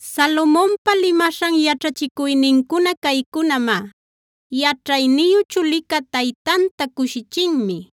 Salomonpa limaśhan yaćhachicuynincuna caycunamá: Yaćhayniyu chulicá taytanta cushichinmi;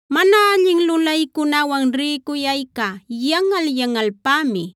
Mana allin lulaycunawan rïcuyayca yanꞌal-yanꞌalpämi;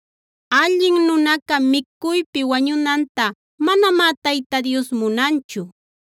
Allin nunaca micuypi wañunanta manamá Tayta Dios munanchu;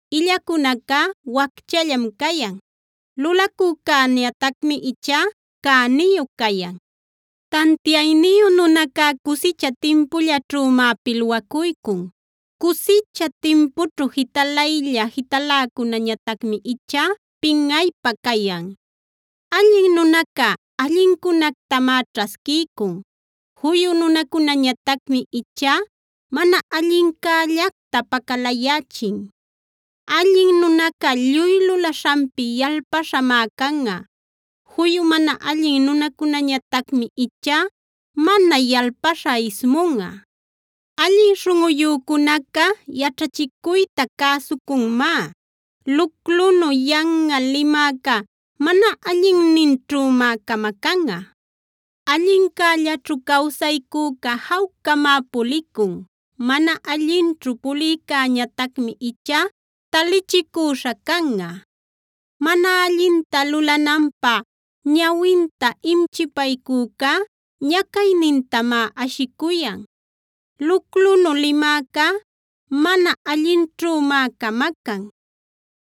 Illacunacá wacchallam cayan; lulacücäñatacmi ichá cäniyu cayan. Tantiayniyu nunacá cusicha timpullaćhümá pilwacuycun; cusicha timpućhu jitalaylla-jitaläcunäñatacmi ichá pinꞌaypä cayan. Allin nunaca allincunactamá ćhasquiycun; juyu nunacunäñatacmi ichá mana allincällacta pacalayächin. Allin nunaca lluy lulaśhanpi yalpaśhamá canꞌa; juyu mana allin nunacunäñatacmi ichá mana yalpaśha ismunꞌa. Allin śhunꞌuyücunaca yaćhachicuyta cäsucunmá; luclunu yanꞌal limäcá mana allinninćhümá camacanꞌa. Allincällaćhu cawsaycüca jawcamá puliycun; mana allinćhu pulïcäñatacmi ichá talichicüśha canꞌa. Mana allinta lulananpä ñawinta imchipaycücá ñacaynintamá ashicuyan; luclunu limäcá mana allinćhümá camacan.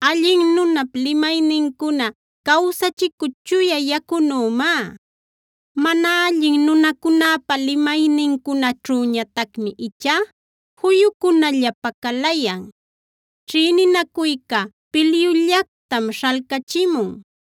Allin nunap limaynincuna cawsachicü chuya yacunümá; mana allin nunacunäpa limaynincunaćhüñatacmi ichá juyucunalla pacalayan. Ćhïninacuyca pilyullactam śhalcachimun;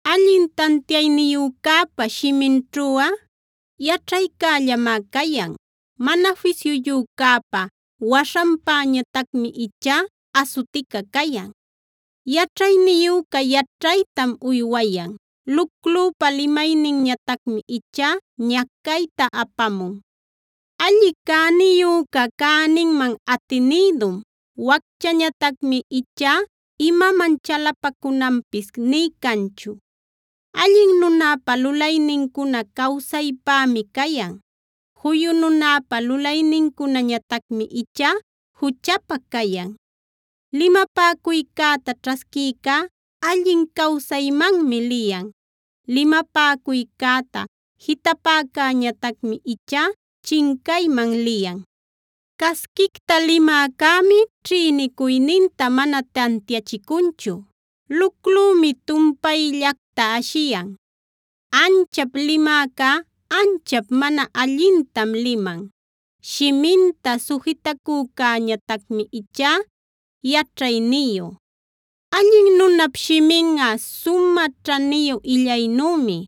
Allin tantiayniyücäpa shiminćhuꞌa yaćhaycällamá cayan; mana fisyuyücäpa waśhanpäñatacmi ichá asutica cayan. Yaćhayniyüca yaćhaytam uywayan; luclüpa limayninñatacmi ichá ñacayta apamun. Alli cäniyüca cäninman atinïdum; wacchäñatacmi ichá imaman chalapacunanpis nï canchu. Allin nunäpa lulaynincuna cawsaypämi cayan; juyu nunäpa lulaynincunañatacmi ichá juchapa cayan. Limapäcuycäta ćhasquïcá allin cawsaymanmi liyan; limapäcuycäta jitapäcäñatacmi ichá chincayman liyan. Casquicta limäcämi ćhïnicuyninta mana tantiachicunchu; luclümi tumpayllacta ashiyan. Anchap limäcá anchap mana allintam liman; shiminta sujitacücäñatacmi ichá yaćhayniyu. Allin nunap shiminꞌa sumä ćhaniyu illaynümi;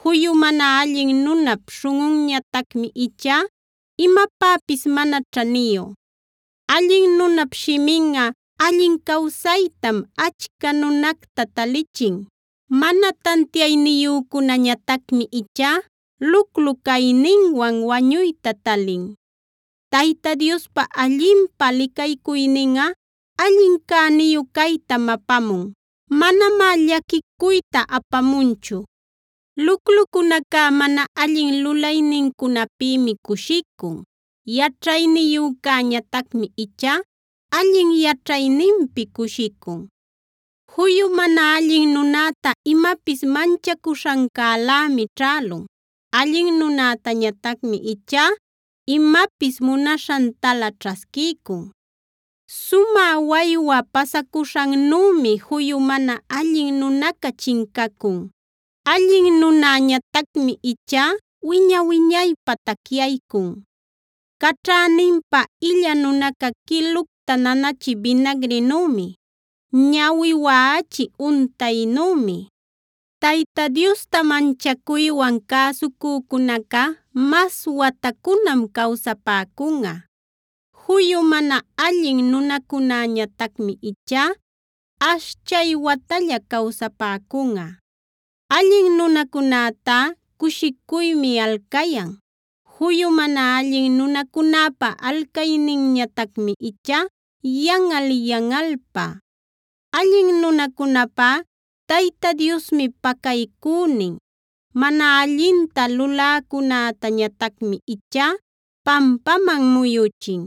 juyu mana allin nunap śhunꞌunñatacmi ichá imapäpis mana ćhaniyu. Allin nunap shiminꞌa allin cawsaytam achca nunacta talichin; mana tantiayniyücunäñatacmi ichá luclu cayninwan wañuyta talin. Tayta Diospa allinpä licaycuyninꞌa allin cäniyu caytam apamun; manamá llaquicuyta apamunchu. Luclucunacá mana allin lulaynincunapïmi cushicun; yaćhayniyücäñatacmi ichá allin yaćhayninpi cushicun. Juyu mana allin nunäta imapis manchacuśhancälämi ćhälun; allin nunäñatacmi ichá imapis munaśhantalä ćhasquiycun. Sumä waywa pasacuśhannümi juyu mana allin nunaca chincacun; allin nunäñatacmi ichá wiña-wiñaypä tacyaycun. Caćhäninpä illa nunaca quilucta nanachï binagrinümi; ñawi waꞌachï untaynümi. Tayta Diosta manchacuywan cäsucücunaca mas watacunam cawsapäcunꞌa; juyu mana allin nunacunäñatacmi ichá ashchay watalla cawsapäcunꞌa. Allin nunacunätá cushicuymi alcayan; juyu mana allin nunacunäpa alcayninñatacmi ichá yanꞌal-yanꞌalpä. Allin nunäcunäpá Tayta Diosmi pacaycünin; mana allinta luläcunätañatacmi ichá pampaman muyuchin.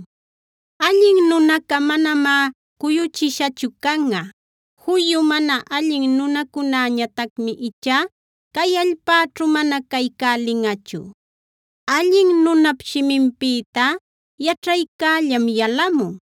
Allin nunaca manamá cuyuchishachu canꞌa; juyu mana allin nunacunäñatacmi ichá cay allpäćhu mana caycälinꞌachu. Allin nunap shiminpïtá yaćhaycällam yalamun;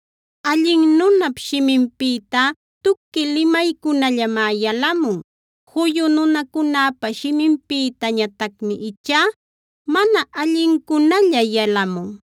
Allin nunap shiminpïtá tuqui limaycunallamá yalamun; juyu nunacunäpa shiminpïtañatacmi ichá mana allincunalla yalamun.